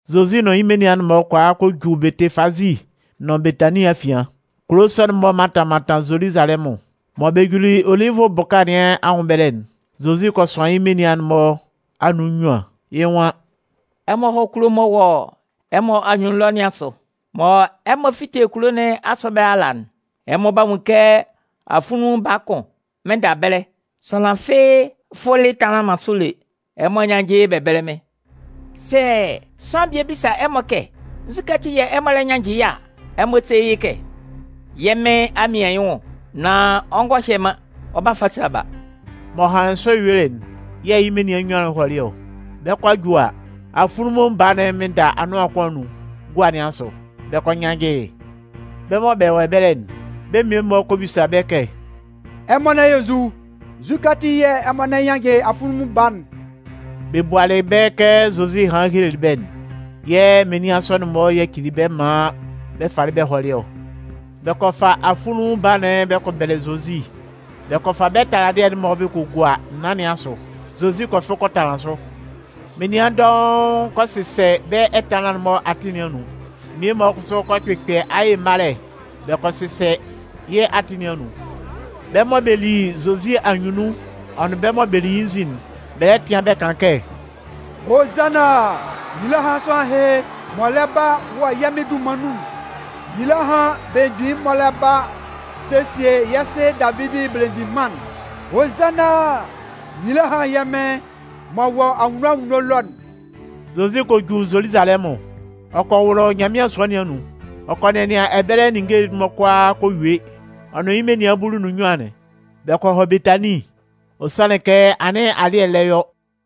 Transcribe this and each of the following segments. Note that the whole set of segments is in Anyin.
Zozi nʋn yɩ́ menian'n-mɔ kɔ a kɔ ju Bɛtɩfaze nʋn Betanin afian. Kulo sɔ'n-mɔ mantan mantan Zoluzalɛmʋn. Mɔ bɛ juli Olivʋ bʋka nɩn anwʋn ɛbɛlɛ'n, Zozi kɔ sʋan yɩ́ menian'n-mɔ anun nnyuan, yɩ́ nwan: “Ɛmɔ hɔ́ kulo'n m'ɔ wɔ ɛmɔ anyunnun ɛlɔ nɩn asʋ. Mɔ ɛmɔ 'fite kulo nɩn asʋ ɛbɛlɛ ala'n, ɛmɔ 'ba nwun yɩ́ kɛ afunlunmun baa kʋn mɩnnda ɛbɛlɛ, sʋanlan fɩ́ɩ́ fʋlɩ tanlanlɩn man sʋ lé. Ɛmɔ nyánnjɩ yɩ́ bɛ bɛ́lɛ mɩ́n. Sɛ sʋanlan bie bisa ɛmɔ kɛ nzukɛ ati yɛ̂ ɛmɔ lɛ nyannjɩ yɩ́ a, ɛmɔ sé yɩ́ kɛ: ‘Yɛ́ Mɩn a mian yɩ́ nwʋn, nan ɔ ngɔ hye man, ɔ 'ba fa sa ba.’” M'ɔ hanlɩn sɔ yuelɩ'n yɛ̂ yɩ́ menian nnyuan'n hɔlɩ ɔ. Bɛ 'kɔ a ju a, afunlunmun baa'n mɩnnda anʋan kʋn anun, gua nɩn asʋ. Bɛ kɔ nyannjɩ yɩ́. Bɛ́ mɔ bɛ wɔ ɛbɛlɛ'n, bɛ́ mmie-mɔ kɔ bisa bɛ́ kɛ: “Ɛmɔ lɛ yɔ nzu? Nzu ati yɛ̂ ɛmɔ lɛ nyannjɩ afunlunmun baa'n?” Bɛ bualɩ bɛ́ kɛ Zozi hanlɩn helelɩ bɛ́'n, yɛ̂ menian sɔ'n-mɔ yacili bɛ́ maan bɛ falɩ bɛ hɔlɩ ɔ. Bɛ kɔ fa afunlunmun baa'n bɛ kɔ bɛlɛ Zozi, bɛ kɔ fa bɛ́ taladɩɛ'n-mɔ bɛ kɔ gua naan nɩn asʋ. Zozi kɔ fʋ kɔ tanlanlɩn sʋ. Menian dɔʋn kɔ sɩsɛ bɛ́ ɛtanlan'n-mɔ atɩn nɩn anun. Mmie-mɔ kʋsʋ kɔ kpɩkpɛ aye malɛ bɛ kɔ sɩsɛ yɩ́ atɩn nɩn anun. Bɛ́ mɔ bɛ li Zozi anyunnun'n ɔ nʋn bɛ́ mɔ bɛ li yɩ́ nzin'n, bɛ lɛ tɩan bɛ kan kɛ: “Hozanna! Nyila hán sʋanlan ɛhɩ m'ɔ lɛ ba wɔ yɛ́ Mɩn dunman nun'n! Nyila hán belemgbin'n m'ɔ lɛ ba sesie yɛ́ sɩ Davidi belemgbin mân'n. Hozanna! Nyila hán yɛ́ Mɩn m'ɔ wɔ anwunno anwunno ɛlɔ'n!” Zozi kɔ ju Zoluzalɛmʋn. Ɔ kɔ wʋlʋ Nyanmɩan sua nɩn anun. Ɔ kɔ nɛnɩan ɛbɛlɛ ninnge'n-mɔ kʋalaa kɔ yue. Ɔ nʋn yɩ́ menian bulu nʋn nnyuan'n, bɛ kɔ hɔ Betanin. Ɔ sanlɩn kɛ anɩn alɩ́ɛ lɛ yɔ.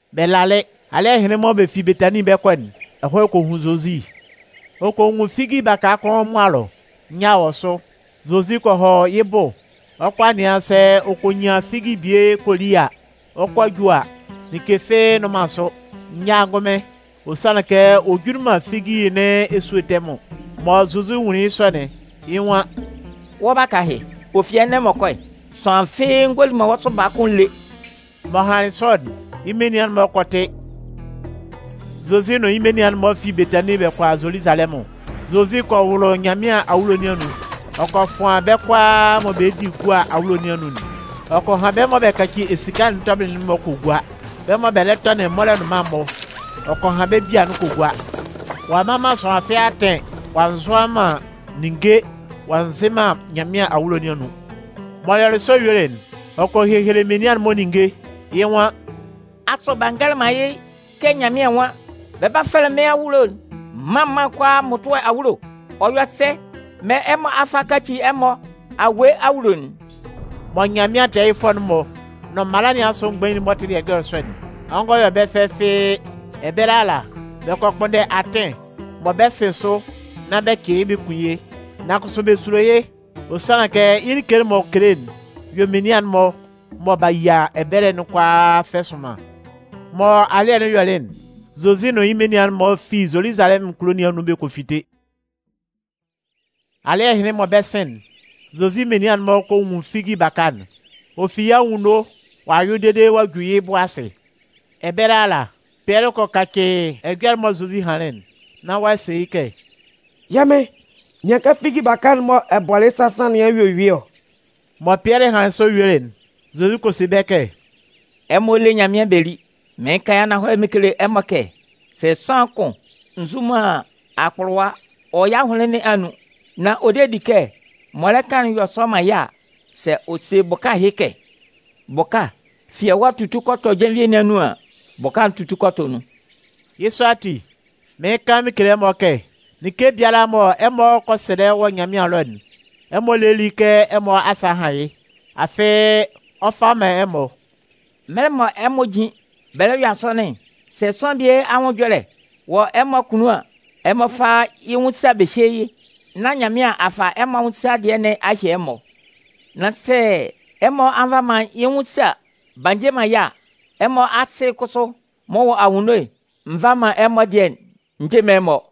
Bɛ lalɩ alɩ́ɛ hɩnlɩn mɔ bɛ fi Betanin bɛ 'kɔ'n, ɛhɔɛ kɔ hun Zozi. Ɔ kɔ nwun figi baka kʋn mʋa ɛlɔ. Nyâ wɔ sʋ. Zozi kɔ hɔ yɩ́ bʋ ɔ 'kɔ a nɩan sɛ ɔ kɔ nyan figi bie kɔ li a. Ɔ 'kɔ ju a, like fɩ́ɩ́ nnʋn man sʋ, nyâ ngʋnmɩn, ɔ sanlɩn kɛ ɔ juli man figi nɩn esúe tɛmʋn. Mɔ Zozi nwunlin yɩ́ sɔ'n, yɩ́ nwan: “Wɔ́ baka ɛhɩ, ɔ fi ɛnɛ m'ɔ kɔ'n, sʋanlan fɩ́ɩ́ ngɔ li wɔ́ sʋ baa kʋ́n lé!” M'ɔ hanlɩn sɔ'n, yɩ́ menian'n-mɔ kɔ tɩ. Zozi nʋn yɩ́ menian'n-mɔ fi Betanin bɛ kɔ a Zoluzalɛmʋn. Zozi kɔ wʋlʋ Nyanmɩan awulo nɩn anun. Ɔ kɔ fʋan bɛ́ kʋalaa mɔ bɛ di gua awulo nɩn anun'n. Ɔ kɔ han bɛ́ mɔ bɛ kaci esika'n tɔbɩlɩ'n-mɔ kɔ gua. Bɛ́ mɔ bɛ lɛ tɔnɩn mɔlɔnʋnman'n-mɔ, ɔ kɔ han bɛ́ bia'n mɔ kɔ gua. Ɔ'a mman man sʋanlan fɩ́ɩ́ atɩn ɔ'a nzʋa man ninnge ɔ'a nzɩn man Nyanmɩan awulo nɩn anun. M'ɔ yɔlɩ sɔ yuelɩ'n, ɔ kɔ hehele menian'n-mɔ ninnge. Yɩ́ nwan: “Asʋ b'a ngɛlɛ man yɩ́ kɛ Nyanmɩan nwan: Bɛ 'ba fɛlɛ mɩ́n awulo'n mân mân kʋalaa mmʋtʋɛ awulo ɔ? Nan ɔ yɔ sɛ mɔ ɛmɔ a fa a kaci ɛmɔ awue awulo'n?” Mɔ Nyanmɩan tɛɛyɩfʋɛ'n-mɔ nʋn mala nɩn asʋ mgbain'n-mɔ tɩlɩ ɛjɔlɛ sɔ'n, ɔ ngɔ yɔ bɛ́ fɛ fɩ́ɩ́. Ɛbɛlɛ ala, bɛ kɔ kpʋnndɛ atɩn mɔ bɛ 'sɩn sʋ nán bɛ cɩ yɩ́ bɛ kun yɩ́. Nan kʋsʋ bɛ sulo yɩ́, ɔ sanlɩn kɛ yɩ́ like'n m'ɔ kele'n yɔ menian'n-mɔ mɔ b'a yia ɛbɛlɛ'n kʋalaa fɛ sʋnman. Mɔ alɩ́ɛ'n yɔlɩ'n, Zozi nʋn yɩ́ menian'n-mɔ fi Zoluzalɛmʋn kulo nɩn anun bɛ kɔ fite. Alɩ́ɛ hɩnlɩn mɔ bɛ 'sɩn'n, Zozi menian'n-mɔ kɔ nwun figi baka'n. Ɔ fi yɩ́ anwunno ɔ'a yʋɩ dede ɔ'a ju yɩ́ bʋ asɩ. Ɛbɛlɛ ala, Pɩɛlɩ kɔ kacɩ ɛjɔlɛ'n mɔ Zozi hanlɩn'n. Nán ɔ'a se yɩ́ kɛ: “Yɛ́ Mɩn, nɩan kɛ figi baka'n mɔ ɛ bɔlɩ yɩ́ sasan nɩn a yue yʋɩ ɔ.” Mɔ Pɩɛlɩ hanlɩn sɔ yuelɩ'n, Zozi kɔ se bɛ́ kɛ: “Ɛmɔ lé Nyanmɩan bɛ lí. Mɩɩn kan yɩ́ ananhɔlɛ mɩn kele ɛmɔ kɛ sɛ sʋanlan kʋn nzu man akpʋlʋwa wɔ yɩ́ ahʋnlɩn nɩn anun, nan ɔ de di kɛ m'ɔ lɛ kan'n 'yɔ sɔ man yɩ́ a, sɛ ɔ se bʋka ɛhɩ kɛ: ‘Bʋka, fi ɛwa tutu kɔ tɔ jenvie nɩn anun’ an, bʋka'n 'tutu kɔ tɔ nun. Yɩ́ sɔ ati, mɩɩn kan mɩn kele ɛmɔ kɛ, like biala mɔ ɛmɔ kɔ sɛlɛ wɔ Nyanmɩan ɛlɔ'n, ɛmɔ lé lí kɛ ɛmɔ asa a han yɩ́. Afɩ ɔ 'fa man ɛmɔ. Mɛlɛ mɔ ɛmɔ jin bɛ lɛ yɔ asɔnɩn'n, sɛ sʋanlan bie anwʋn ɛjɔlɛ wɔ ɛmɔ akunnun an, ɛmɔ fá yɩ́ nwʋn sa bɛ hyé yɩ́. Nán Nyanmɩan a fa ɛmɔ anwʋn sa dɩɛ nɩn a hye ɛmɔ. [ Nan sɛ ɛmɔ a nva man yɩ́ nwʋn sa b'a nje man yɩ́ a, ɛmɔ Asɩ'n kʋsʋ m'ɔ wɔ anwunno'n nva man ɛmɔ dɩɛ'n nje man ɛmɔ.”]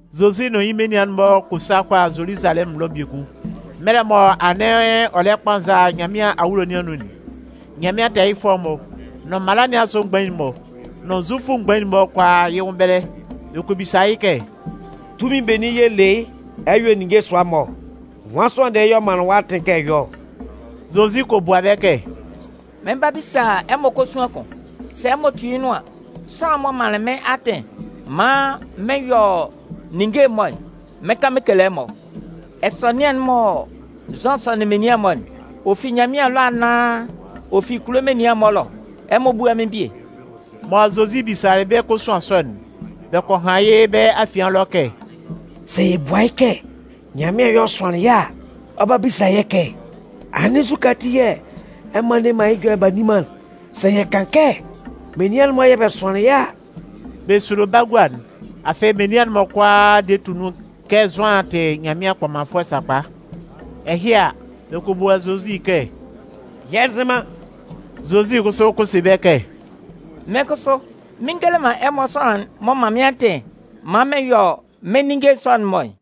Zozi nʋn yɩ́ menian'n-mɔ kɔ sa kɔ hɔ Zoluzalɛmʋn ɛlɔ biekun. Mɛlɛ mɔ anɩn ɔ lɛ kpanza Nyanmɩan awulo nɩn anun'n, Nyanmɩan tɛɛyɩfʋɛ'n-mɔ, nʋn mala nɩn asʋ mgbain'n-mɔ, nʋn Zufʋ mgbain'n-mɔ kɔ a yɩ́ nwʋn ɛbɛlɛ. Bɛ kɔ bisa yɩ́ kɛ: “Tunmin benin yɛ̂ ɛ le yɩ́ ɛ yɔ ninnge sʋa mɔ ɔ? Nwan sʋanlan dɩɛ yɛ̂ ɔ manlɩn wɔ́ atɩn kɛ ɛ yɔ́ ɔ?” Zozi kɔ bua bɛ́ kɛ: “Mɩn 'ba bisa ɛmɔ kosuan kʋn. Sɛ ɛmɔ tu yɩ́ nʋan an, sʋanlan'n m'ɔ manlɩn mɩ́n atɩn maan mɩn yɔ ninnge'n-mɔ'n, mɩn 'kan mɩn kele ɛmɔ. Ɛsɔnɩan'n mɔ Zʋan sɔnɩn menian'n-mɔ'n, ɔ fi Nyanmɩan ɛlɔ anaan ɔ fi kulo menian'n-mɔ ɛlɔ ɔ? Ɛmɔ búa mɩ́n bie.” Mɔ Zozi bisalɩ bɛ́ kosuan sɔ'n, bɛ kɔ han yɩ́ bɛ́ afian ɛlɔ kɛ: “Sɛ yɛ bua yɩ́ kɛ: ‘Nyanmɩan yɛ̂ ɔ sʋanlɩn yɩ́’ a, ɔ 'ba bisa yɛ́ kɛ: ‘Anɩn nzukɛ ati yɛ̂ ɛmɔ a nne man yɩ́ ɛjɔlɛ'n b'a nni man'n?’ Sɛ yɛ kan kɛ: ‘Menian'n-mɔ yɛ̂ bɛ sʋanlɩn yɩ́’ a, …” (Bɛ sulo bagua'n, afɩ menian'n-mɔ kʋalaa de tʋ nun kɛ Zʋan tɩ Nyanmɩan kpɔmanfʋɛ sakpa.) Ɛhɩ a, bɛ kɔ bua Zozi kɛ: “Yɛ nzɩ man.” Zozi kʋsʋ kɔ se bɛ́ kɛ: “Mɩ́n kʋsʋ mɩn ngele man ɛmɔ sʋanlan'n m'ɔ man mɩ́n atɩn maan mɩn yɔ mɩ́n ninnge sɔ'n-mɔ'n.”